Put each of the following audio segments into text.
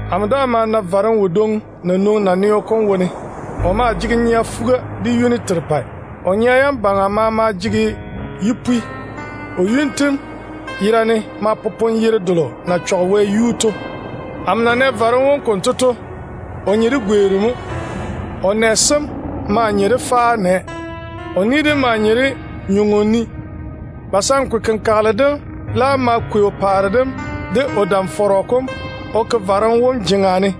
Amo daa ma na juru kodwoŋi ko na nwoŋi naneo kom wone. Ko maa jege nyea fuga de yuni terepɛ. Ko nyea yam baŋa maama maa jege paare yipwi. Ko yuni tem yera ne ma popone yere delo na twe Wɛ to. Amo na nɛ juru kom konto to, ko nye de gweeru mo. Ko nɛ maa nye de faao nɛ, ye ko ni nye de nywoŋo ni. Kayanchɔrɔ kom laam ma kwei ko paare dem de ko dam-fɔrɔ kom ko ke juru kom jeŋa ne.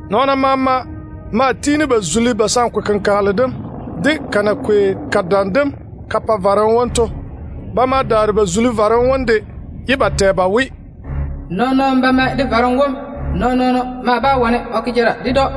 Nɔɔna maama maa kuni dwoona ba zuli kayanchɔrɔ kom, de ko na kwei ko dam dem ko pa juru kom to. Ba ma daare ba zuli juru kom de, ye ba tɛ ba we, “Nɔɔno tera o na mae de juru kom. Nɔɔn-nɔɔno nam bá wane o ke jara de‑ko.”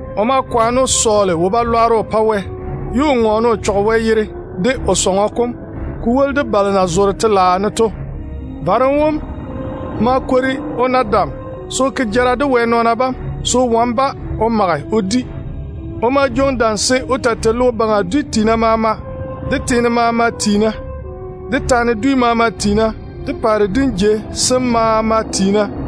Ko ma kwaane ko sɔɔle lwarem ko pa Wɛ, ye ko ta twe Wɛ yere dem, de o sɔŋɔ kom, ko woli de balo na zoore Wɛ telaao ne to. Juru kom ma kwori ko na dam se ko kwaare jara de Wɛ nɔɔna bam, se ko wane-ba ko di. Ko ma jwoŋi dam se ko taa tei logo baŋa dwi maama, de teene maama tiina, de taana dwi maama tiina, de paare dim jei sem maama tiina.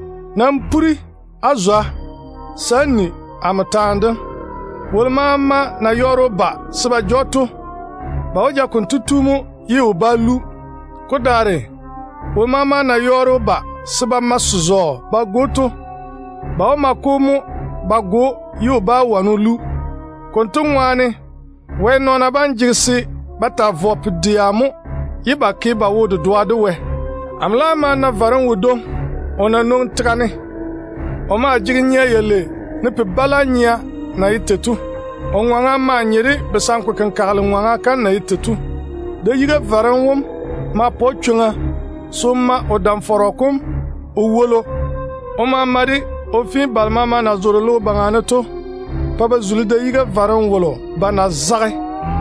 Nam pore-na á zwa se á cheigi amo taane dem. Wolo maama na yɔɔre o ba se o dona ja‑o ba pe to, ba wó ja konto tu mo ye o bá lu. Wolo maama de na yɔɔre o ba se ba ma se-zɔɔ ba go‑o to, ba wó ma-ko mo ba go‑o ye o bá wane o lu. Konto mo tei Wɛ nɔɔna bam jege se ba taa vɔ pu-dɛa, se ba daare ba ke ba wo-dedoa de Wɛ. Amo laam ma na juru kodwoŋi ko na nwoŋi tega ne. Ko maa jege nyea yalei, ne pi-bala nyea na ye tei to. Ko ŋɔŋa maa nye de kayanchɔrɔ ŋɔŋa kam na ye tei to. Da-yiga juru kom ma pa‑ko chwoŋa se ko ma ko dam-fɔrɔ kom ko toŋe ko pa-ko. Ko ma ma dam dem konto ko fe balo maama na zoore logo baŋa ne to pa ba zuli da-yiga juru kolo yuu ba na zage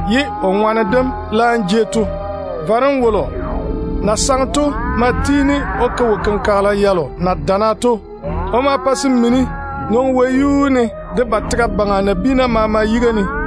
ye ko fufwolo kom laam jei to. Juru kolo na saŋe to ma tiini ko ke wo-kenkagela yalo na dana to. Ko ma pa se mini nwoŋi wɛyuu ne de ba tega baŋa ye nabiina maama zege ba nia.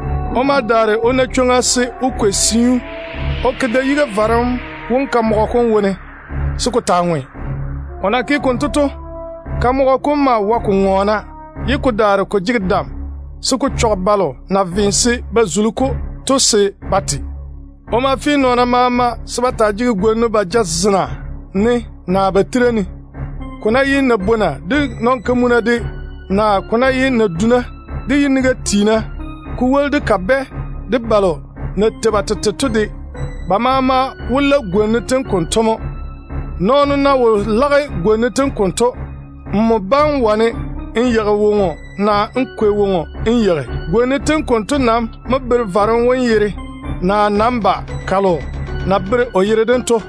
Ko ma daare ko na chwoŋa se ko kwei siu ko ke da-yiga juru kom kamɔgɔ kom wone, se ko taa ŋwe. Ko na ke konto to, kamɔgɔ kom maa wae ko ŋɔɔna, ye ko jege dam se ko pa balo maama na ve se ba zuli-ko to te. Ko ma fe nɔɔna maama se ba taa jege gwona ba jazena ne naa ba tira ne. Ko ná ye nabwona de nɔn-kamuna de, naa ko ná ye naduna de yiniga tiina, ko woli de kabɛ de balo na tei ba tete to de, ba maama wó la gwona yam konto mo. Nɔɔno ná wo lage gwona yam konto, kotu bá wane o yeigi woŋo naa o kwei woŋo o yeigi. Gwona yam konto nam mo bere juru kom yere, naa namba kalo na bere ko yere dem to.